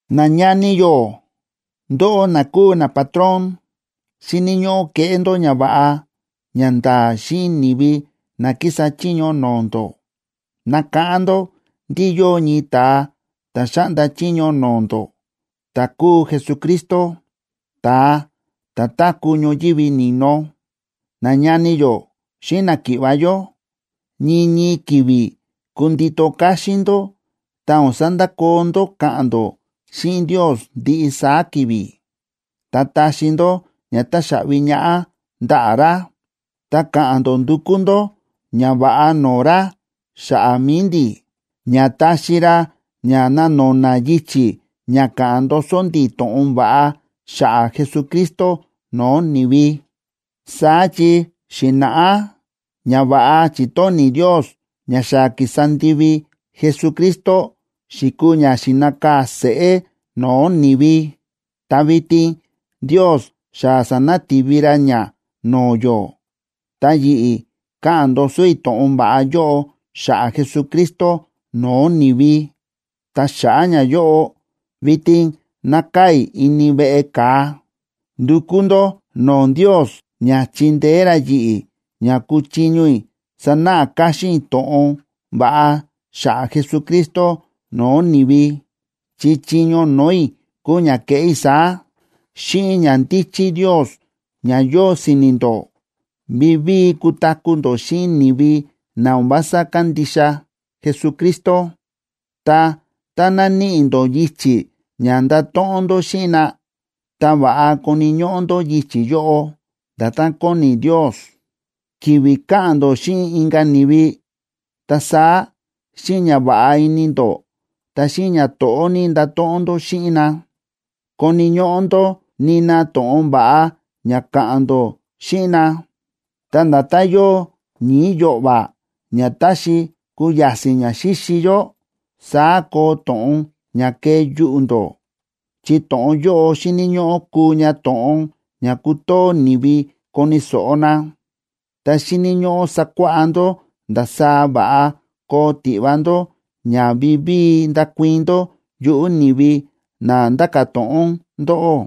Nañani yó, ndóꞌó na kúu napatrón, xíni̱ ñóꞌó keꞌé ndó ñava̱ꞌa ñanda̱a̱ xíꞌin ni̱vi na kísa chiño no̱o̱ ndó. Nakáꞌán ndó ndí yóo ñii ta̱a ta̱ xáꞌnda chiño no̱o̱ ndó, ta̱ kúu Jesucristo, ta̱a ta̱ táku̱ ñoyívi ni̱no. Nañani yó xíꞌin náki̱ꞌva̱ yó, ñii ñii ki̱vi̱ kundito káxín ndó ta o̱n sandakoo ndó káꞌa̱n ndó xíꞌin Ndios ndiꞌi saá ki̱vi̱, ta taxi ndó ña táxaꞌvi ñaꞌá ndaꞌa̱ ra. Ta ka̱ꞌa̱n ndó ndukú ndó ñava̱ꞌa no̱o̱ ra xa̱ꞌa̱ mi̱i ndi̱, ña taxi ra ña ná no̱na̱ yichi̱ ña ka̱ꞌa̱n ndoso ndi̱ to̱ꞌon va̱ꞌa xa̱ꞌa̱ Jesucristo no̱o̱ ni̱vi. Saá chi xi̱na̱ꞌá ñava̱ꞌa chi̱tóni̱ Ndios ña xa ki̱sa ndivi Jesucristo xi̱kuu ña xi̱nakaa̱ seꞌé no̱o̱ ni̱vi, ta vitin Ndios xa sa̱nati̱vi ra ña no̱o̱ yó, ta yi̱ꞌi̱, káꞌa̱n ndoso i̱ to̱ꞌon va̱ꞌa yóꞌo xa̱ꞌa̱ Jesucristo no̱o̱ ni̱vi. Ta xa̱ꞌa̱ ñayóꞌo, vitin nákaa̱ i̱ ini veꞌe ka̱a. Ndukú ndó no̱o̱ Ndios ña chindeé ra yi̱ꞌi̱ ña kuchiño i̱ sanáꞌa káxín i̱ to̱ꞌon va̱ꞌa xa̱ꞌa̱ Jesucristo no̱o̱ ni̱vi, chi chiño no̱o̱ i̱ kúu ña keꞌé i̱ saá. Xíꞌin ñandíchí Ndios ña yóo si̱ni̱ ndó, vivíi kutaku̱ ndó xíꞌin ni̱vi na o̱n vása kándixa Jesucristo. Ta tá naníꞌi ndó yichi̱ ña ndato̱ꞌon ndó xíꞌin na, ta va̱ꞌa koni̱ ñóꞌó ndó yichi̱ yóꞌo, nda̱tán kóni Ndios. Ki̱vi̱ káꞌa̱n ndó xíꞌin inka̱ ni̱vi, ta saá xíꞌin ñava̱ꞌa ini ndó ta xíꞌin ñato̱ꞌó ní ndato̱ꞌon ndó xíꞌin na. Koni̱ ñóꞌó ndó nina to̱ꞌon va̱ꞌa ña ka̱ꞌa̱n ndó xíꞌin na. Ta nda̱tán yóo ñi̱i̱ yo̱ꞌva̱ ña táxi kuya̱si̱n ña xíxi yó, saá koo to̱ꞌon ña kee yuꞌu̱ ndó, chi to̱ꞌon yóꞌo xíni̱ ñóꞌó kuu ña to̱ꞌon ña kutoo ni̱vi koni̱ so̱ꞌo na. Ta xíni̱ ñóꞌó sakuáꞌá ndó ndasaá va̱ꞌa koo tiꞌva ndó ña vivíi ndakuii̱n ndó yuꞌu̱ ni̱vi na nda̱ka̱ to̱ꞌon ndóꞌó.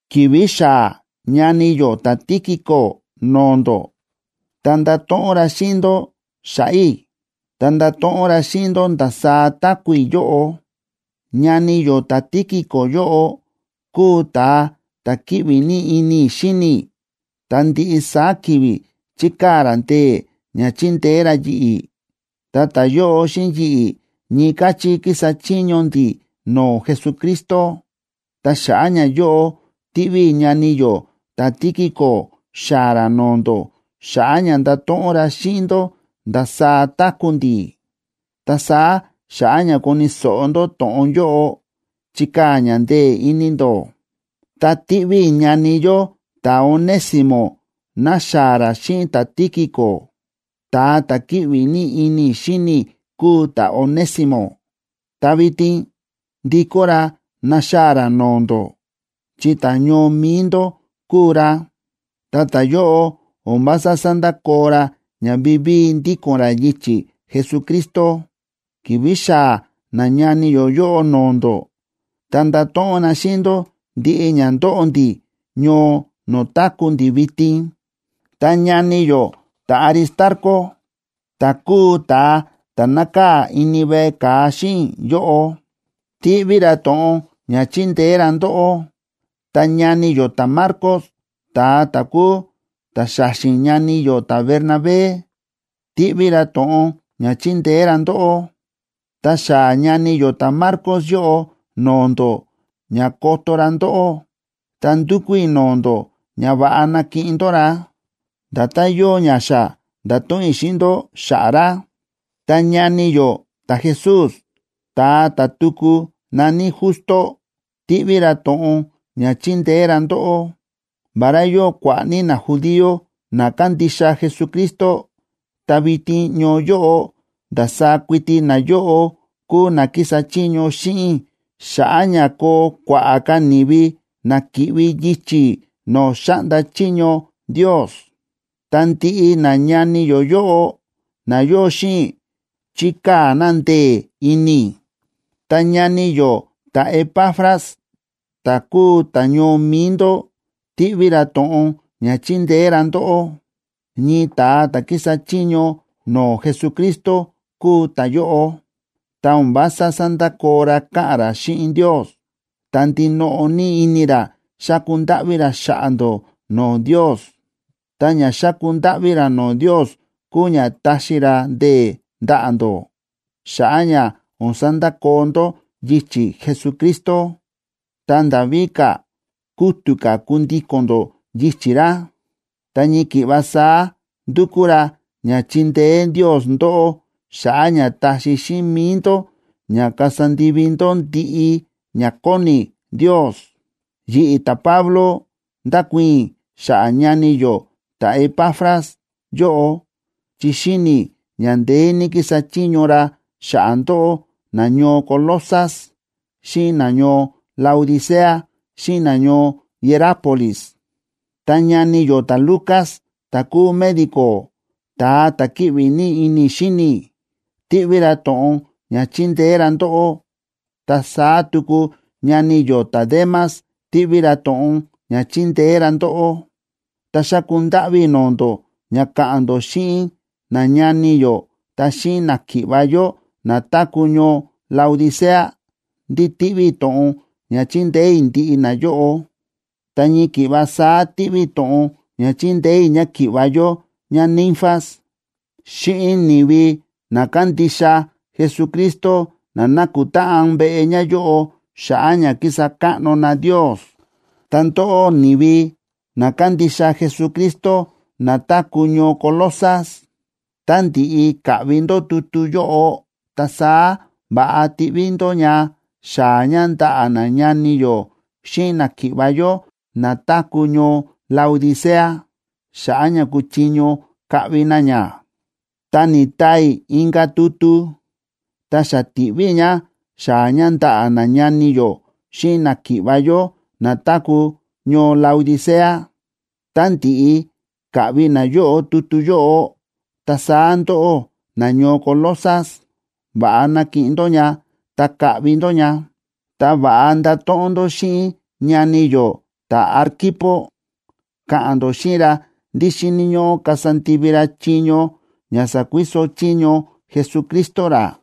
Ki̱vi̱ xaa̱ ñani yó ta̱Tíquico no̱o̱ ndó, ta ndato̱ꞌon ra xíꞌin ndó xa̱ꞌa̱ i̱, ta ndato̱ꞌon ra xíꞌin ndó ndasaá táku̱ i̱ yóꞌo. Ñani yó ta̱Tíquico yóꞌo kúu ta̱a ta̱ kíꞌvi ní ini i̱ xíni i̱, ta ndiꞌi saá ki̱vi̱ chíkaa̱ ra ndee̱ ña chindeé ra yi̱ꞌi̱, ta ta̱yóꞌo xíꞌin yi̱ꞌi̱ ñii káchí kísa chiño ndi̱ no̱o̱ Jesucristo. Ta xa̱ꞌa̱ ñayóꞌo, tíꞌví i̱ ñani yó ta̱Tíquico xaa̱ ra no̱o̱ ndó xa̱ꞌa̱ ña ndato̱ꞌon ra xíꞌin ndó ndasaá táku̱ ndi̱. Ta saá xa̱ꞌa̱ ña koni̱ so̱ꞌo ndó to̱ꞌon yóꞌo, chikaa̱ ña ndee̱ ini ndó. Ta tíꞌví i̱ ñani yó ta̱Onésimo naxaa̱ ra xíꞌin ta̱Tíquico. Ta̱a ta̱ kíꞌvi ní ini i̱ xíni i̱ kúu ta̱Onésimo, ta vitin ndikó ra naxaa̱ ra no̱o̱ ndó, chi ta̱ñoo mi̱i ndó kúu ra. Ta ta̱yóꞌo o̱n vása sándakoo ra ña vivíi ndíko̱n ra yichi̱ Jesucristo. Ki̱vi̱ xaa̱ nañani yó yóꞌo no̱o̱ ndó, ta ndato̱ꞌon na xíꞌin ndó ndiꞌi ña ndóꞌo ndi̱ ñoo no̱o̱ táku̱ ndi̱ vitin. Ta ñani yó ta̱Aristarco, ta̱ kúu ta̱a ta̱ nákaa̱ ini veꞌe ka̱a xíꞌin i̱ yóꞌo, tíꞌví ra to̱ꞌon ña chindeé ra ndóꞌó. Ta ñani yó ta̱Marcos, ta̱a ta̱ kúu ta̱xa̱xi̱n ñani yó ta̱Bernabé, tíꞌví ra to̱ꞌon ña chindeé ra ndóꞌó. Tá xaa̱ ñani yó ta̱Marcos yóꞌo no̱o̱ ndó ña koto ra ndóꞌó, ta ndúkú i̱ no̱o̱ ndó ña va̱ꞌa nakiꞌin ndó ra, nda̱tán yóo ña xa nda̱to̱ꞌon i̱ xíꞌin ndó xa̱ꞌa̱ ra. Ta ñani yó ta̱Jesús, ta̱a ta̱ tuku na̱ní Justo, tíꞌví ra to̱ꞌon ña chindeé ra ndóꞌó. Vará yóo kua̱ꞌa̱ ní najudío na kándixa Jesucristo, ta vitin ñoo yóꞌo ndasaá kuiti nayóꞌo kúu na kísa chiño xíꞌin i̱ xa̱ꞌa̱ ña koo kua̱ꞌa̱ ka̱ ni̱vi na ki̱ꞌvi yichi̱ no̱o̱ xáꞌnda chiño Ndios. Ta ndiꞌi nañani yó yóꞌo na yóo xíꞌin i̱, chíkaa̱ na ndee̱ ini i̱. Ta ñani yó ta̱Epafras, ta̱ kúu ta̱ñoo mi̱i ndó tíꞌví ra to̱ꞌon ña chindeé ra ndóꞌó. Ñii ta̱a ta̱ kísa chiño no̱o̱ Jesucristo kúu ta̱yóꞌo, ta o̱n vása sándakoo ra káꞌa̱n ra xíꞌin Ndios, ta ndinoꞌo ní ini ra xáku ndáꞌví ra xa̱ꞌa̱ ndó no̱o̱ Ndios. Ta ña xáku ndáꞌví ra no̱o̱ Ndios kúu ña taxi ra ndee̱ ndaꞌa̱ ndó xa̱ꞌa̱ ña o̱n sandakoo ndó yichi̱ Jesucristo, ta nda̱ víka̱, kútu̱ ka̱ kundíko̱n ndó yichi̱ ra. Ta ñii ki̱ꞌva saá ndúkú ra ña chindeé Ndios ndóꞌó xa̱ꞌa̱ ña taxi xíꞌin mi̱i ndó ña kasa ndivi ndó ndiꞌi ña kóni Ndios. Yi̱ꞌi̱, ta̱Pablo, ndákuii̱n i̱ xa̱ꞌa̱ ñani yó ta̱Epafras yóꞌo, chi xíni i̱ ña ndeé ní kísa chiño ra xa̱ꞌa̱ ndóꞌó, nañoo Colosas xíꞌin nañoo Laodicea xíꞌin nañoo Hierápolis. Ta ñani yó ta̱Lucas, ta̱ kúu médico, ta̱a ta̱ kíꞌvi ní ini i̱ xíni i̱, tíꞌví ra to̱ꞌon ña chindeé ra ndóꞌó. Ta saá tuku ñani yó ta̱Demas tíꞌví ra to̱ꞌon ña chindeé ra ndóꞌó. Ta xáku ndáꞌví i̱ no̱o̱ ndó ña ka̱ꞌa̱n ndó xíꞌin nañani yó ta xíꞌin náki̱ꞌva̱ yó na táku̱ ñoo Laodicea, ndí tíꞌví i̱ to̱ꞌon ña chindeé i̱ ndiꞌi nayóꞌo. Ta ñii ki̱ꞌva saá tíꞌví i̱ to̱ꞌon ña chindeé i̱ ñáki̱ꞌva̱ yó ñáNinfas xíꞌin ni̱vi na kándixa Jesucristo na nákutáꞌan veꞌe ñáyóꞌo xa̱ꞌa̱ ña kísa káꞌno na Ndios. Ta ndóꞌó, ni̱vi na kándixa Jesucristo na táku̱ ñoo Colosas, tá ndi̱ꞌi kaꞌvi ndó tutu yóꞌo, ta saá va̱ꞌa tiꞌví ndó ña xaa̱ ña ndaꞌa̱ nañani yó xíꞌin náki̱ꞌva̱ yó na táku̱ ñoo Laodicea, xa̱ꞌa̱ ña kuchiño kaꞌvi na ña. Ta ni̱taa i̱ inka̱ tutu ta xa ti̱ꞌví i̱ ña xaa̱ ña ndaꞌa̱ nañani yó xíꞌin náki̱ꞌva̱ yó na táku̱ ñoo Laodicea. Tá ndi̱ꞌi kaꞌvi nayóꞌo tutu yóꞌo, ta saá ndóꞌó nañoo Colosas, va̱ꞌa nakiꞌin ndó ña ta kaꞌvi ndó ña. Ta va̱ꞌa ndato̱ꞌon ndó xíꞌin ñani yó ta̱Arquipo, ka̱ꞌa̱n ndó xíꞌin ra ndí xíni̱ ñóꞌó kasa ndivi ra chiño ña sa̱kuiso chiño Jesucristo ra.